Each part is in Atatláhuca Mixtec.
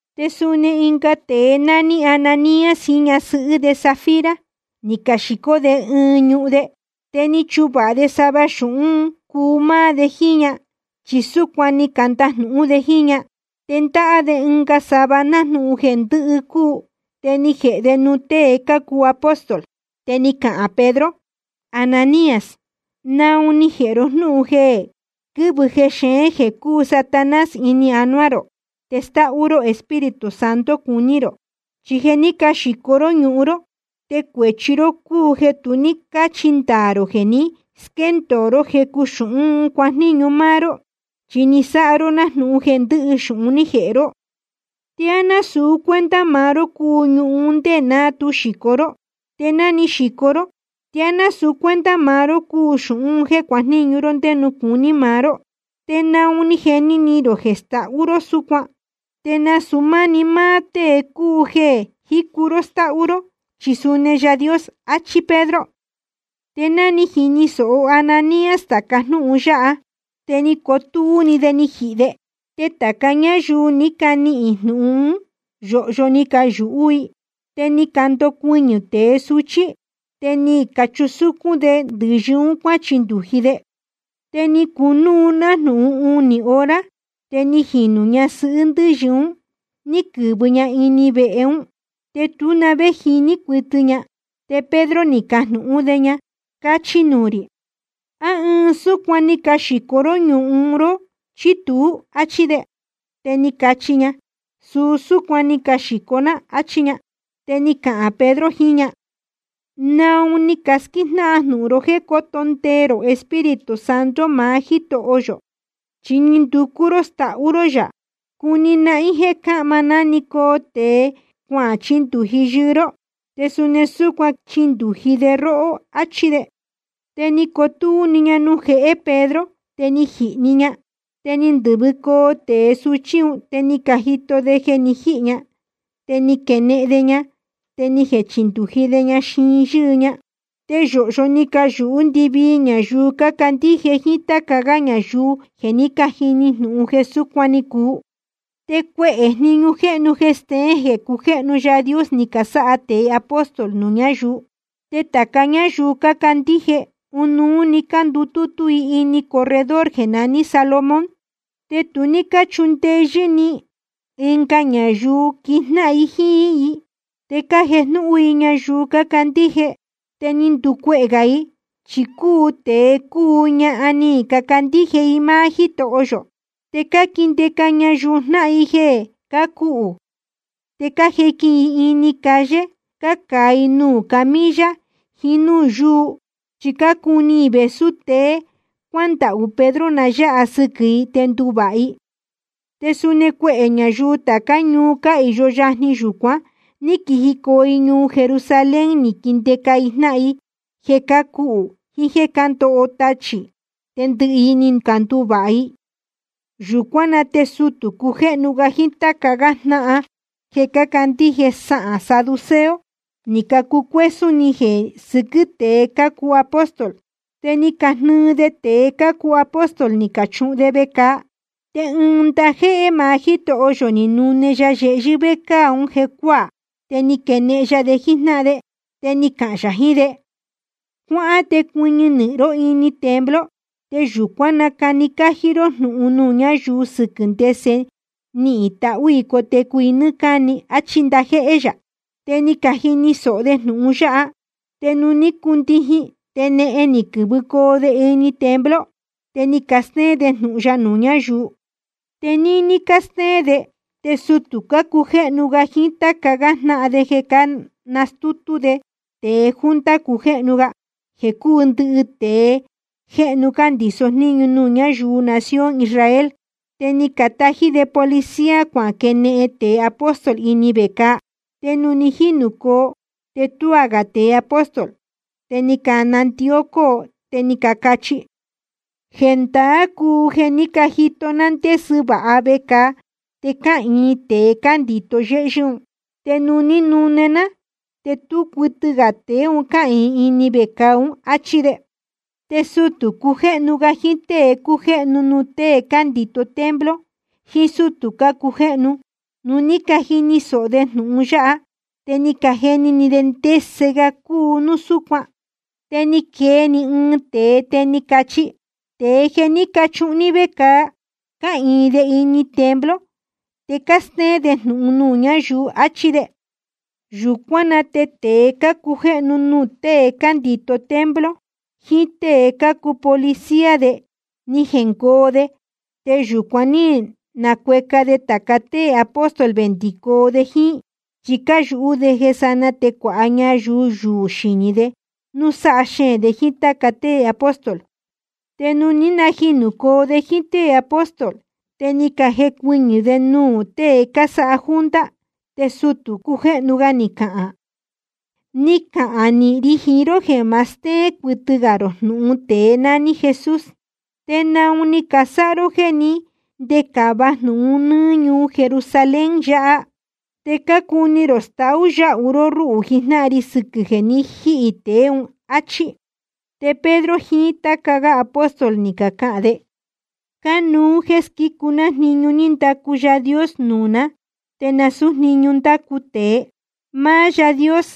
Te suni ɨnga tēe nání Ananías jiín ñasɨhɨ́ de Safira, ni caxīcó de ɨɨn ñuhun de. Te ni chuvāha de sava xūhún un cuu máá de jíín ña, chi súcuan ni candajnūhún de jíín ña, te ndáhá de ɨnga sava nájnūhun jeē ndɨ́hɨ cúu, te ni jēhe de nuū tée cácuu apóstol. Te ni cahān Pedro: Ananías, ¿naun ni jēhe ro jnúhun jeē quɨ̄vɨ jexeén, jeē cúu Satanás, ini anuá rō te stáhú ró Espíritu Santo cuní rō? Chi jeē ní caxīco ró ñuhun ró te cuēchi ró cúu jeē tu ní cáchi ndaā rō jeē ni squéndōo ró jecu xūhún un cuajníñu máá ró, chi ni sáha ró nájnūhun jeē ndɨhɨ xūhun ní jēhe ró. ¿Te á násūu cuenta maá ró cúu ñuhun un ndé ná tu xīco ró? Te ná ni xīco ró ¿te á násūu cuenta maá ró cúu xūhun jéē cuajníñu ró ndé nuū cuní maá ró? ¿Te naun ni jeni ni rō jeē stahú ró súcuan? Te nasūu máni máá tée cúu jeē jícu ró stáhú ró, chi suni Yaā Dios, áchí Pedro. Te ná ni jini sōho Ananías tāca jnúhun yáha, te ni cotúú‑ni de ni jihī de. Te tāca ñáyuu ní canihīn jnūhun ún, yōhyo ni cayūhú i. Te ni candocuɨñɨ̄ tēe suchí, te ni cachusúcún de ndɨ̄yɨ un cuáchindūji de. Te ni cunúu nájnūhun unī hora. Te ni jinū ñasɨhɨ́ ndɨ́yɨ un ní quɨ̄vɨ ña ini vehe ún, te tú na vé jiní cuɨtɨ ña. Te Pedro ni cajnūhún de ña: Cachi nuū rī, ¿á ɨɨn súcuan‑ni ni caxīco ró ñuhun ró chí tuú? áchí de. Te ni cachi ña: Suu súcuan‑ni ni caxīco ná, áchí ña. Te ni cahān Pedro jiín ña: ¿Naun ni casquíjnáhan jnūhun ró jéē cóto ndee rō Espíritu Santo maá Jítoho yō? Chi ni nducú ró stahú ró yā. Cuni nahín jéē cáhma nanecoo tēe cuachindūji yɨɨ ró, te suni súcuan quichindūji de róhó, áchí de. Te ni cotúú‑ni ña nuū jehé Pedro te ni jihī‑ni ña. Te ni ndɨ̄vɨcoo tēe suchí un te ni cajito de jeē jé ni jihī ña, te ni caquenehen de ña, te ni jechindūji de ña xiin yɨ́ɨ ña. Te yōhyo ni cayūhú ndɨvii ñayuu cácandíje jíín táca gá ñayuu jeē ní cajini jnūhun jeē súcuan ni cuu. Te cuehē jniñu jéhnu jeē steén jeē cujéhnu Yaā Dios ni casáha tēe apóstol nuū ñáyuu. Te tāca ñáyuu cácandíje, ɨnuú‑ni cándutútú i ini corredor jeē naní Salomón. Te tu ní cáchundeyɨ́ ni ɨnga ñayuu quijnáhan jíín i. Te cájejnúhún i ñayuu cácandíje. Te ni nducuehē gā i, chi cúu tēe cúu ñahan ni cacandíje i máá Jítoho yō. Te cáquindeca ñayuu jnáhan i jeē cácuhū, te cájequin i ini calle cácaa i nuū camilla jiín núū yúu, chi cácuni i vēsú ste cuándahū Pedro na yáha sɨquɨ̄ i te nduvāha i. Te suni cuehē ñayuu tācá ñuu cáhīyo yajni yūcuan ní quijicoo i ñuu Jerusalén ni caquindeca i jnáhan i jeē cácuhū jiín jéē cándoho tachī, te ndɨhɨ i ni canduvāha i. Yūcuán na te sutū cujéhnu ga jiín táca gá jnáhan jeē cácandíje sahān saduceo, ni cacucuésún ni jeē sɨquɨ́ tēe cácuu apóstol. Te ni cajnɨɨ de tēe cácuu apóstol ni cachuhun de vecāa. Te ɨɨn ndajéhé maá Jítoho yō ni nune ya yehyɨ́ vécāa ún jecuáā, te ni quenehen ya de jíjnáhan de. Te ni cahān yā jiín de: Cuáhán te cuɨñɨ ró ini templo, te yūcuán nacani cájí ró jnūhun nuū ñáyuu sɨquɨ̄ ndese nihīn tahú i cotecu i nɨ́ɨ́ cáni, áchí ndajéhé yā. Te ni cajini sōho de jnūhun yáha. Te nuū ní cundijin te nehen ni quɨ̄vɨcoo de ini templo, te cástéén de jnūhun ya nuū ñáyuu. Te níní cástéén de te sutū cujéhnu ga jiín táca jnáhan de ni canastútú de tēe junta cujéhnu ga, jeē cúu ndɨhɨ tēe jéhnu cándīso jníñu nuū ñáyuu nación Israel. Te ni catají de policía cuaquenehen tēe apóstol ini vecāa. Te nuū ni jínūcoo te tuá gā tēe apóstol. Te ni canandió cóo te ni cacachi: Jendaá cúu jeē ní cajito ná ndésɨ vāha vecāa, te cáhīin tēe cándīto yéhyɨ́ un. Te nuū ní canune ná, te tú cuɨtɨ gā tēe un cáhīin ini vecāa ún, áchí de. Te sutū cujéhnu ga jiín tée cújéhnu nuū tée cándīto templo jiín sútū cácujéhnu, nuū ní cajini sōho de jnūhun yáha, te ni cajeni ni de ndese ga cúu un núu súcuan. Te ni quee‑ni ɨɨn tēe te ni cachi: Tēe jeē ní cachuhun ní vecāa, cáhīin de ini templo, te cástéén de jnūhun nuū ñáyuu, áchí de. Yūcuán na te tēe cácujéhnu nuū tée cándīto templo, jiín tée cácuu policía de, ni jengoo de, te yúcún ní nacueca de tāca tée apóstol vendicoo de jíín, chi cáyūhú de jeē sanaa te cuāha ñayuu yuū xinī de núu sáha xeēn de jíín táca tée apóstol. Te nuū ní najinūcoo de jíín tée apóstol, te ni cajecuɨñɨ̄ de nuū tée cásáha junta. Te sutū cujéhnu ga ni cahān: Ni cacahān nīhin ri jiín ró jeē ma steén cuɨtɨ gā rō jnūhun tēe nání Jesús. ¿Te naun ni casáha ró jéē ní ndecāva jnūhun un nɨ́ɨ́ ñuu Jerusalén yāhá? Te cácuni rō staú yáhu ró rúhū jijnáhan ri sɨquɨ̄ jeē ni jíhī tēe ún, áchí. Te Pedro jiín táca gá apóstol ni cacahān de: Cánuú jéē squícu ná jniñu ní ndacu Yaā Dios nuū ná te nasūú jniñu nándacu tēe. Máá Yáā Dios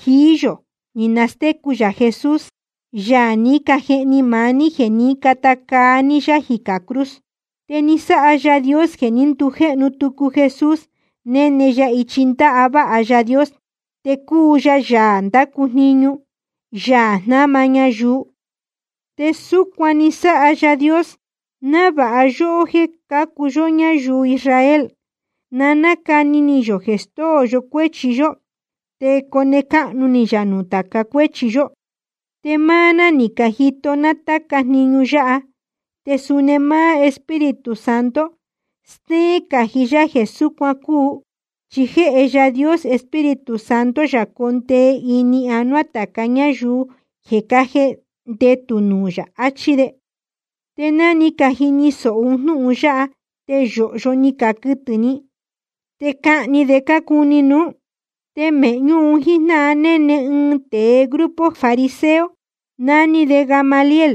jií yō ni nastécu yā Jesús, Yaā ní cajehni maá ní jeē ní cata caa ní yá jicā cruz. Te ni sáha Yaā Dios jeē ní ndujéhnu tucu Jesús néne ya ichi ndáváha Yaā Dios, te cúu ya Yaā ndácu jniñu, Yaā jnáma ñayuu. Te súcuan ni sáha Yaā Dios návāha yóhó, jéē cácuu yó ñáyuu Israel, na nácani ni yō jeē stóo yó cuéchi yó, te cone cáhnu ni yā nuū tāca cuéchi yó. Te máá ná ni cajito ná táca jniñu yáha, te suni máá Espíritu Santo steén cají yá jeē súcuan cúu, chi jéhe Yaā Dios Espíritu Santo yā condee ini anuá tāca ñáyuu jeē cájendetū nuū yā, achí de. Te ná ni cajini sōho un jnúhun yáha, te yōhyo ni caquɨtɨ̄ ni, te cahni de cácuni nuú. Te mēhñú un jíjnáhan néne ɨɨn tēe grupo fariseo nání de Gamaliel,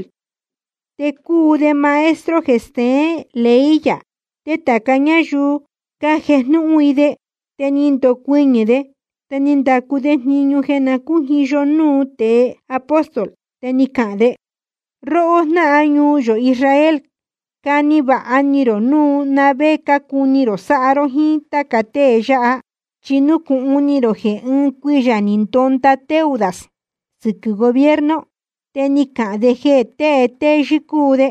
te cúu de maestro jeē steén ley yā, te tāca ñáyuu cájejnúhún i de. Te ni ndocuɨñɨ̄ de, te ni ndacu de jniñu jeē na cújiyo núu tēe apóstol. Te ni cahān de: Róhó jnáhan ñuu yō Israel, cani vāha ni rō núu na vé cácuni rō sáha ró jíín táca tée yáha. Chi nucūhun ni rō jeē ɨɨn cuiyā ni ndonda Teudas sɨquɨ̄ gobierno, te ni cahān de jeē tée téyɨ́ cúu de,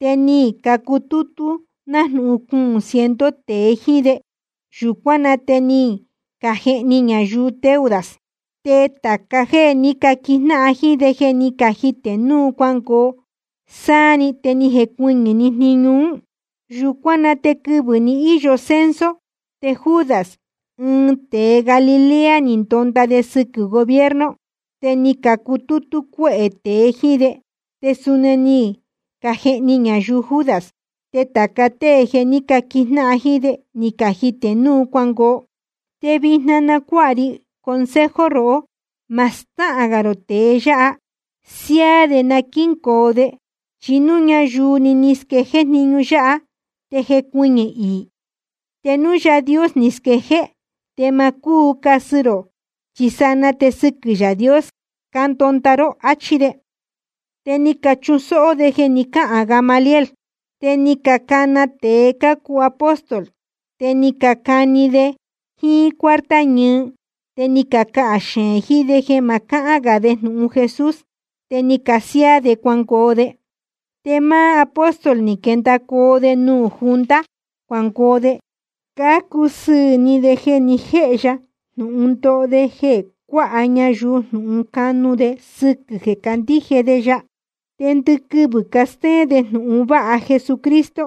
te ni cacutútú nájnūhun cuūn ciento tēe jíín de. Yūcuán na te ni cajehni ñayuu Teudas, te tāca jéē ní caquijnáhan jíín de ni cajitē núu cuangoo sáá‑ni, te ni jecuɨñɨ̄‑ni jniñu ún. Yūcuán na te quɨvɨ̄ ni íyo censo te Judas, ɨɨn tēe Galilea, ni ndonda de sɨquɨ̄ gobierno, te ni cacutútú cuéhē tēe jíín de. Te suni ni cajehni ñayuu Judas, te tāca tée jeē ní caquijnáhan jíín de ni cajitē núu cuangoo. Te vijna na cuáha ri consejo rohó. Ma stáhān gā rō tēe yáha. Siáá de na quíngoo de. Chi núu ñayuu‑ni ni squejéé jniñu yáha, te jecuɨñɨ̄ iī. Te núu Yaā Dios ni squejéé, te ma cúu casɨ rō, chi sanaa te sɨquɨ̄ Yaā Dios cándonda ró, áchí de. Te ni cachusóhó jéē ni cáhān Gamaliel. Te ni canacana tēe cácuu apóstol, te ni cacani de jíín cuarta ñɨɨ te ni cacahān xeēn jiín de jeē ma cahán gā de jnūhun Jesús, te ni casiáá de cuangoo de. Te máá apóstol ni quendacoo de nuū junta cuangoo de, cácusɨɨ̄ ni de jeē ni jéhe ya jnūhun ndoho de jeē cuáha ñayuu jnūhun canu de sɨquɨ̄ jeē cácandíje de ya. Te ndɨquɨvɨ̄ castéén de jnūhun vāha Jesucristo,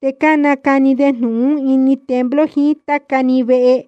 te cánacani de jnūhun ún ini templo jiín táca‑ni vehe.